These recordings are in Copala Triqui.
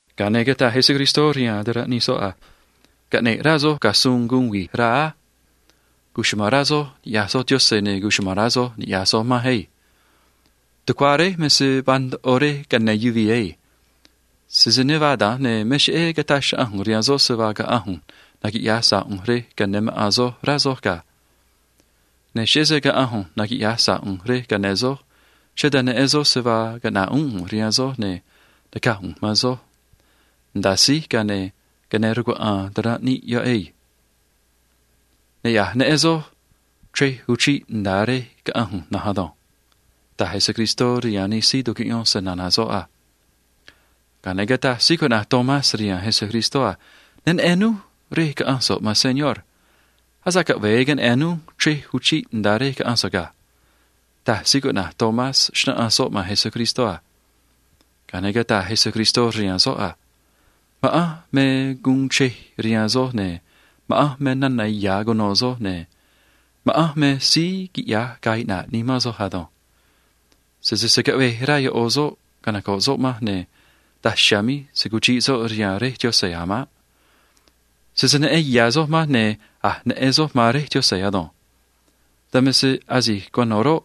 Ga̱a ne̱ cataj Jesús rihaan ta̱ranꞌ nij soꞌ a: ―Caꞌne̱ꞌ rá soj ga̱ suun ꞌnaꞌ xruꞌ nimán á. Cuchuma̱n rá soj ni̱ꞌyaj soj Yaꞌanj, ne̱ cuchuma̱n rá soj ni̱ꞌyaj soj manj á. Tucuá Réj me se vaa ndoꞌo rej ca̱yáán yuvii̱ ado̱nj. Sese ne vaa da̱nj, ne̱ me cheꞌé cataj xnaꞌanj ꞌu̱nj rihaan soj se vaa caꞌa̱nj ꞌu̱nj naquiꞌya̱j sa̱ꞌ ꞌu̱nj rej ca̱yáán maꞌa̱n soj, rá soj ga̱. Ne̱ cheꞌé se caꞌa̱nj ꞌu̱nj naquiꞌya̱j sa̱ꞌ ꞌu̱nj rej ca̱yáán soj, cheꞌé dan neꞌen soj se vaa caꞌna̱ꞌ uún ꞌu̱nj rihaan soj, ne̱ naca̱j ꞌu̱nj man soj a. Nda̱a síj, ga̱a ne̱ ca̱yáán rcuaꞌa̱a̱n ta̱ranꞌ níꞌ rej yoꞌ ado̱nj. Ne̱ a̱j neꞌen soj chrej uchiꞌ nda̱a rej caꞌa̱nj ꞌu̱nj na̱nj ado̱nj ―taj Jesús rihaan nij síí tucuꞌyón snana̱ soꞌ a. Ga̱a ne̱ cataj síí cuꞌna̱j Tomás rihaan Jesús a: ―Ne neꞌen núj rej caꞌa̱nj so̱ꞌ, maan Señor. Asa̱ꞌ caꞌve̱e queneꞌe̱n núj chrej uchiꞌ nda̱a rej caꞌa̱nj so̱ꞌ ga̱ ―taj Tomás, xnáꞌanj soꞌ man Jesús a. Ga̱a ne̱ cataj Jesús rihaan soꞌ a: ―Ma̱ꞌanj me guun chrej rihaan soj, ne̱ ma̱ꞌanj me nana̱ ya̱ cuno̱ soj, ne̱ ma̱ꞌanj me síí quiꞌya̱j ga̱a̱ iꞌna̱ꞌ nimán soj ado̱nj. Sese se̱ caꞌvej rá ꞌo̱ soꞌ canoco̱ꞌ soꞌ manj, ne̱ daj chiha̱a̱ míj se̱ cuchiꞌ soꞌ rihaan Réj Yaꞌanj a̱ maꞌ. Sese neꞌen ya̱ soj manj, ne̱ a̱j neꞌen soj man Réj Yaꞌanj ado̱nj. Dan me se asi̱j cuano̱ roꞌ,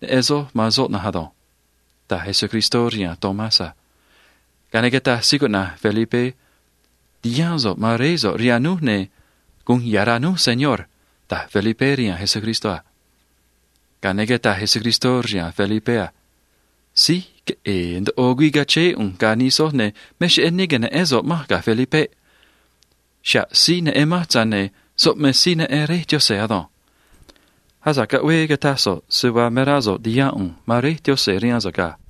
neꞌen soj man soꞌ na̱nj ado̱nj ―taj Jesús rihaan Tomás a. Ga̱a ne̱ cataj síí cuꞌna̱j Felipé a: ―Ti̱haán so̱ꞌ man Réé so̱ꞌ rihaan núj, ne̱ gu̱un ya̱ rá núj, Señor ―taj Felipé rihaan Jesús a. Ga̱a ne̱ cataj Jesús rihaan Felipé a: ―Felipe, síj queꞌe̱e̱ ndoꞌo güii cachéé ꞌu̱nj ga̱ nij soj, ne̱ me cheꞌé ne que̱neꞌén so̱ꞌ manj ga̱. Xa̱ꞌ síí neꞌen manj, tza̱j ne̱ soꞌ me síí neꞌen Réj Yaꞌanj ado̱nj. Asa̱ꞌ caꞌvee cataj so̱ꞌ se vaa me rá so̱ꞌ ti̱haán ꞌu̱nj man Réj Yaꞌanj rihaan so̱ꞌ ga̱.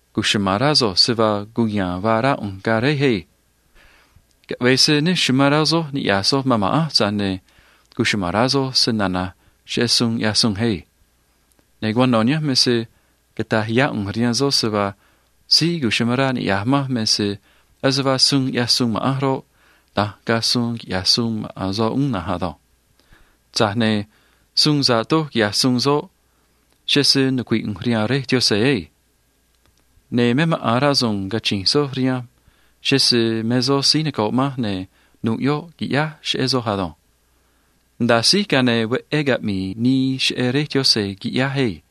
’Cuchuma̱n rá soj se vaa cuya̱a̱n vaa rá ꞌu̱nj ga̱ Réj á. Caꞌve̱e se ne amán rá soj niꞌya̱j soj man ma̱ꞌanj, tza̱j ne̱ cuchuma̱n rá soj snana̱j cheꞌé suun sa̱ꞌ noco̱o ꞌyáá ꞌu̱nj á. Ne̱ cuano̱ nihánj me se cata̱j yá ꞌu̱nj rihaan soj se vaa síí amán rá niꞌya̱j manj me se ase vaa suun sa̱ꞌ noco̱o ꞌyaj ma̱ꞌanj roꞌ, da̱nj ga̱a̱ quiꞌya̱j maꞌa̱n soꞌ uún na̱nj ado̱nj. Tza̱j ne̱ suun sa̱ꞌ noco̱o doj quiꞌya̱j soꞌ, cheꞌé se nucui̱ꞌ ꞌu̱nj rihaan Réj Yaꞌanj na̱nj á. ’Ne̱ me maꞌa̱n rasu̱u̱n cachi̱nj soj cheꞌé se‑chu̱vií ꞌu̱nj, ne̱ nu̱ꞌ yoꞌ qui̱ꞌyáj cheꞌé soj ado̱nj. Nda̱a síj, ga̱a ne̱ veꞌé uxrá caꞌmi̱i̱ nii cheꞌé Réj Yaꞌanj, qui̱ꞌyáj na̱nj ado̱nj.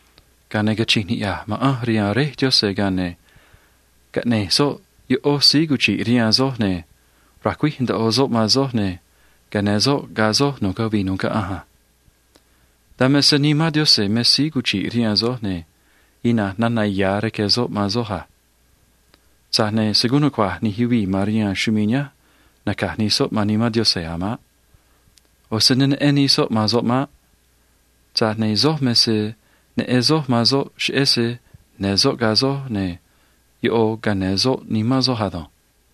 Ga̱a ne̱ cachi̱nj niꞌya̱j ma̱ꞌanj rihaan Réj Yaꞌanj, ga̱a ne̱ caꞌne̱j soꞌ ꞌó síí cuchi̱ꞌ rihaan soj, ne̱ ra̱cuíj ndoꞌo soꞌ man soj, ne̱ ca̱yáán soꞌ ga̱ soj nu̱ꞌ cavii nu̱ꞌ caꞌanj a. Dan me se Nimán Yaꞌanj me síí cuchi̱ꞌ rihaan soj, ne̱ ina̱nj nana̱ ya̱ rque̱ soꞌ man soj a. Tza̱j ne̱ se̱ guun nucua̱j nij síí noco̱ꞌ se‑chre̱j chumii̱ nihánj naca̱j nij soꞌ man Nimán Yaꞌanj a̱ maꞌ. ꞌO̱ se ne neꞌen nij soꞌ man soꞌ maꞌ. Tza̱j ne̱ soj me se neꞌen soj man soꞌ, cheꞌé se ya̱nj soꞌ ga̱ soj, ne̱ ꞌo̱ ca̱yáán soꞌ nimán soj ado̱nj.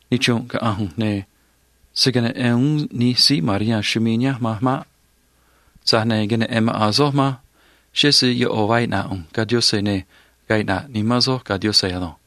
Nichrunꞌ caꞌa̱nj ꞌu̱nj, ne̱ se̱ queneꞌen uún nij síí noco̱ꞌ se‑chre̱j chumii̱ nihánj manj maꞌ. Tza̱j ne̱ queneꞌe̱n maꞌa̱n soj manj, cheꞌé se ꞌo̱ vaa iꞌna̱ꞌ ꞌu̱nj, ne̱ ga̱a̱ iꞌna̱ꞌ nimán soj ado̱nj.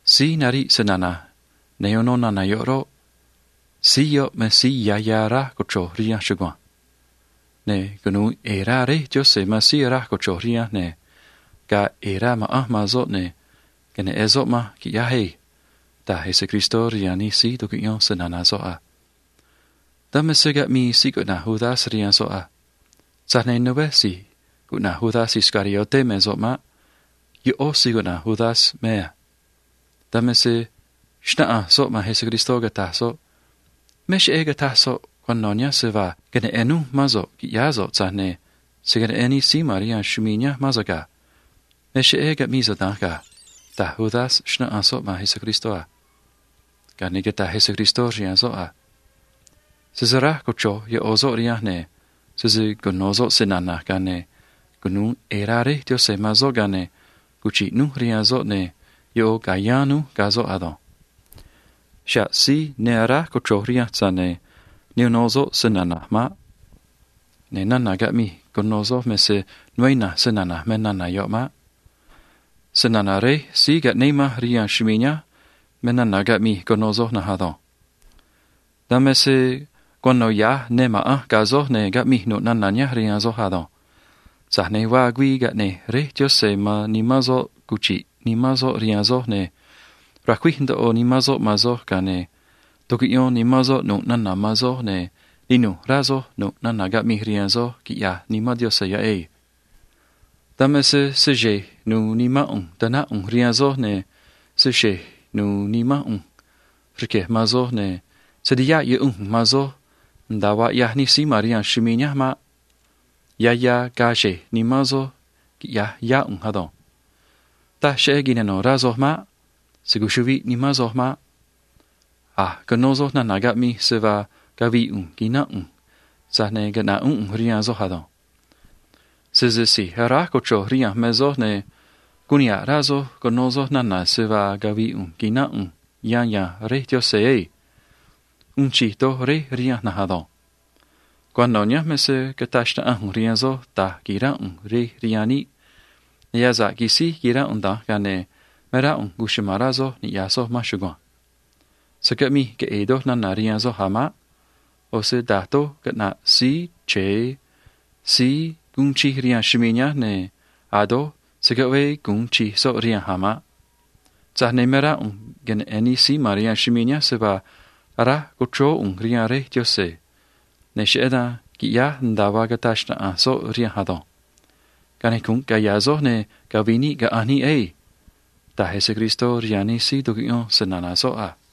Síí nariꞌ nij suun caꞌnéꞌ ꞌu̱nj ne̱ uno nij suun yoꞌ roꞌ, me síí ya̱ ya̱ aráj cochro̱j rihanj chugua̱nj. Ne̱ cunu̱u ꞌe̱e̱ rá Réj Yaꞌanj man síí aráj cochro̱j rihanj, ne̱ ga̱a̱ ꞌe̱e̱ rá ma̱ꞌanj man soꞌ, ne̱ queneꞌe̱n soꞌ manj, qui̱ꞌyáj ado̱nj ―taj Jesús rihaan nij síí tucuꞌyón snana̱ soꞌ a. Dan me se caꞌmii síí cuꞌna̱j Judas rihaan soꞌ a. Tza̱j ne̱ né si̱j cuꞌna̱j Judas Iscariote me soꞌ maꞌ. ꞌÓ síí cuꞌna̱j Judas me soꞌ a. Dan me se xnáꞌanj soꞌ man Jesús, cataj soꞌ a: ―Me cheꞌé cataj so̱ꞌ cuano̱ nihánj se vaa queneꞌe̱n núj mán so̱ꞌ qui̱ꞌyáá so̱ꞌ, tza̱j ne̱ se̱ queneꞌen nij síí noco̱ꞌ se‑chre̱j chumii̱ nihánj mán so̱ꞌ ga̱ ―taj Judas, xnáꞌanj soꞌ man Jesús a. Ga̱a ne̱ cataj Jesús rihaan soꞌ a: ―Síí aráj cochro̱j rihanj me se cuno̱ soꞌ snana̱j, ne̱ cunu̱u ꞌe̱e̱ rá Réj Yaꞌanj man soꞌ, ga̱a ne̱ cuchi̱ꞌ rój rihaan soꞌ, ne̱ ꞌo̱ ca̱yáán rój ga̱ soꞌ ado̱nj. Xa̱ꞌ síí ne aráj cochro̱j rihanj, tza̱j ne̱ ne uno soꞌ snana̱j maꞌ. Ne̱ nana̱ caꞌmij cuno soj me se né ina̱nj snana̱j me yoꞌ maꞌ. Snana̱ Réj síí caꞌnéé manj rihaan chumii̱ nihánj me nana̱ caꞌmij cuno soj na̱nj ado̱nj. ’Dan me se ya̱nj ma̱ꞌanj ga̱ soj, ne̱ caꞌmij nu̱ꞌ nana̱ nihánj rihaan soj ado̱nj. Tza̱j ne̱ vaa güii caꞌne̱j Réj Yaꞌanj man Nimán soꞌ cuchi̱ꞌ Nimán soꞌ rihaan soj cheꞌé se‑chu̱vií ꞌu̱nj a. Ne̱ ra̱cuíj ndoꞌo Nimán soꞌ man soj, ga̱a ne̱ tu̱cuꞌyón Nimán soꞌ nu̱ꞌ nana̱ man soj a. Ne̱ ninu̱j rá soj nu̱ꞌ nana̱ caꞌmij rihaan soj, quiꞌya̱j Nimán Yaꞌanj yoꞌ na̱nj ado̱nj. ’Dan me se se xe̱j nu̱u̱ nimán ꞌu̱nj ta̱náj ꞌu̱nj rihaan soj, ne̱ se xe̱j nu̱u̱ nimán ꞌu̱nj rque̱j man soj, ne̱ se̱ tihaꞌ yuꞌunj ꞌu̱nj man soj nda̱a vaa ꞌyaj nij síí noco̱ꞌ se‑chre̱j chumii̱ nihánj maꞌ. Ya̱ ya̱ ga̱a̱ xe̱j nimán soj, quiꞌya̱j yá ꞌu̱nj ado̱nj. Taj cheꞌé nu̱u̱ xruꞌ nimán soj maꞌ. Se̱ cuchuꞌviꞌ nimán soj maꞌ. A̱j cuno soj nana̱ caꞌmij, se vaa cavi̱i̱ ꞌu̱nj quina̱nꞌ ꞌu̱nj, tza̱j ne̱ caꞌna̱ꞌ uún ꞌu̱nj rihaan soj ado̱nj. Sese si̱j aráj cochro̱j rihanj me soj, ne̱ guun niha̱ꞌ rá soj cuno soj nana̱ se vaa cavi̱i̱ ꞌu̱nj quina̱nꞌ ꞌu̱nj yan ya̱nj Réj Yaꞌanj asuun tza̱j á. ꞌO̱ se síí noco̱o doj mej Réj rihanj na̱nj ado̱nj. ’Cuano̱ nihánj me se cataj xnaꞌanj ꞌu̱nj rihaan soj da̱j qui̱ránꞌ ꞌu̱nj rej rihaan níꞌ, ga̱a ne̱ asa̱ꞌ quisíj quiránꞌ ꞌu̱nj da̱nj, ga̱a ne̱ cuchuma̱n rá soj ni̱ꞌyaj soj manj chugua̱nj. Se̱ caꞌmij queꞌe̱e̱ doj nana̱ rihaan soj a̱ maꞌ. ꞌO̱ se da̱j doj caꞌna̱ꞌ Síí Chre̱e síí uun chij rihaan chumii̱ nihánj, ne̱ a̱ doj se̱ caꞌvee gu̱un chij soꞌ rihanj a̱ maꞌ. Tza̱j ne̱ me rá ꞌu̱nj queneꞌe̱n nij síí noco̱ꞌ se‑chre̱j chumii̱ nihánj se vaa aráj co̱chróó ꞌu̱nj rihaan Réj Yaꞌanj, ne̱ cheꞌé dan qui̱ꞌyáj nda̱a vaa caꞌneꞌ soꞌ suun rihanj ado̱nj. Canicu̱nꞌ caya̱ soj, ne̱ cavi̱i̱ níꞌ caꞌa̱nj níꞌ á ―taj Jesús rihaan nij síí tucuꞌyón snana̱ soꞌ a.